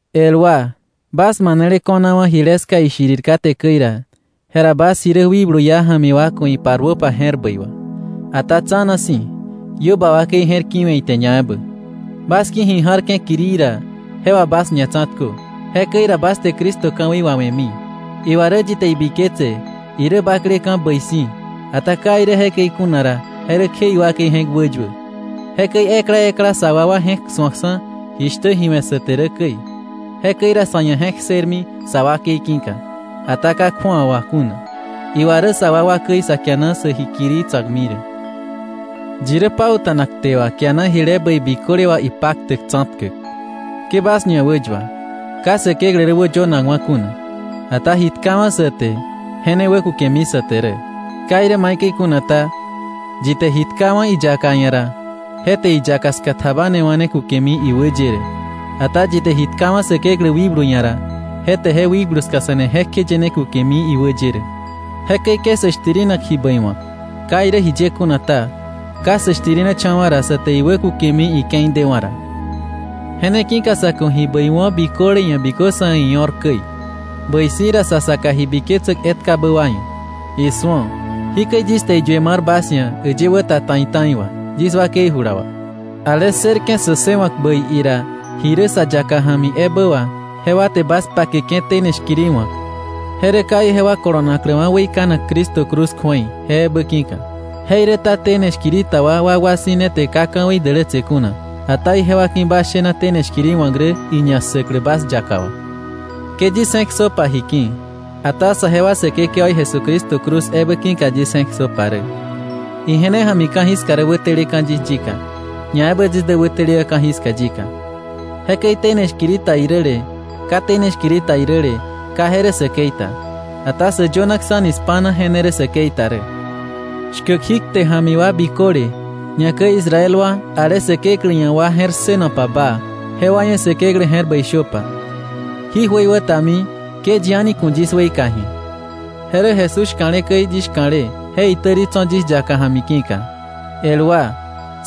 El wa, bas manele ko̱nawa̱ jile ska ishirir kate käi ra, jera bas ji rä wikblu iá ja̱mi wa ku̱ iparuöpa je̱r bäi wà. Ata tsa̱na si̱, iö ba wakei je̱r ki̱we̱ ite ñaebä. Bas ki̱ ji ja̱rke̱ kirii ra, je wà bas ñatsa̱tkö. Jekäi ra bas te Cristo ka̱wei wawe̱mi. Iwa rä yi te ibiketse irä bakleka̱ bäi si̱, ata ka irä jekäi kuna ra, je rä kje iwakei je̱k wäyuä. Jekäi ekla ekla sa wakwa je̱k su̱oksa̱ jishtä ji we̱ sä te rä käi. Jekäi ra sa̱ ia̱ je̱k ssërmi sa wakei ki̱ka, ata ka kju̱awa wà kuna. Iwa rä sa wakwa käi sa kiana sä ji kirii tsa̱kmi rä. Yi rä pauta̱nak kte wà kiana jile bäi biköle wà ipaktäk tsa̱tkäk. Ke bas ñawäyua. Ka Säkeklä rä wäyönakwa̱ kuna. Ata ji tkawa̱ sa te, je ne wäkukemi sa te rä. Ka irä maikäi kuna ta, yi te ji tkawa̱ iyaka ia̱ ra, je te iyaka ska tjabanewa̱ ne kukemi iwä ye rä. Ata yi te ji tkawa̱ Säkeklä wikblu ia̱ ra, je te je Wikblu ska se̱ne jekjeye ne kukemi iwä ye rä. Jekäi ke sä shtirina ji bäi wa̱k. Ka irä jiye kuna ta, ka sä shtirinecha̱wa̱ ra, sa te iwä kukemi ike̱i dewa̱ ra. Je ne ki̱ka sa̱ ku̱ ji bäi wo̱ biköle ia̱ bikö sa̱ ia̱ io̱r käi, bäi si̱ ra sa saka ji biketsäk etkabä wa ia̱. Isu̱o, jikäi yis te iyue mar bas ia̱ äyë wä ta ta̱i ta̱i wà, yis wakei jula wà. Ale ssërke̱ sä ssëwa̱k bäi ira ji rä sa yaka ja̱mi ebä wà, jewa te bas pakeke̱ tene shkiri wa̱k, je rä ka ijewa kolonakläwa̱ weikanak Cristo cruz kju̱ei, je ebä ki̱ka. Jeiräta tene shkiri ta wa wakwa si̱ ne te ka ka̱wei dälätse kuna, ata ijewa ki̱ bas shena tene shkiri wa̱k rä iñassäklä bas yaka wà. Ke yis je̱k ssöpa ji ki̱, ata saje wa Säkekewaí Jesucristo cruz ebä ki̱ka yis je̱k ssöpa rä. Ije ne ja̱mi ka̱jiska rä wäteleka̱ yis yika, ñaebä yis dä wäteleka̱ ka̱jiska yika. Jekäi tene shkiri ta iräle ka tene shkiri ta iräle, ka je rä säkei ta, ata sä yönaksa̱ni spa̱na je ne rä säkei ta rä. Shkäk jí kte ja̱mi wa biköle, ñakäi Israel wa, ale Säkeklä ia̱ wa je̱r ssënopa baa, jewa ia̱ Säkeklä je̱r bäi shöpa. Jí jöiwätami ke yi a̱ni ku̱ yis weika ji̱a. Je rä Jesús shka̱le käi yis shka̱le, je itäri tso̱ yis yaka ja̱mi ki̱ka. El wa,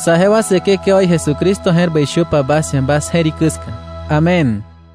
saje wa Säkekewaí Jesucristo je̱r bäi shöpa bas ia̱ bas je̱rikä ska. Amén.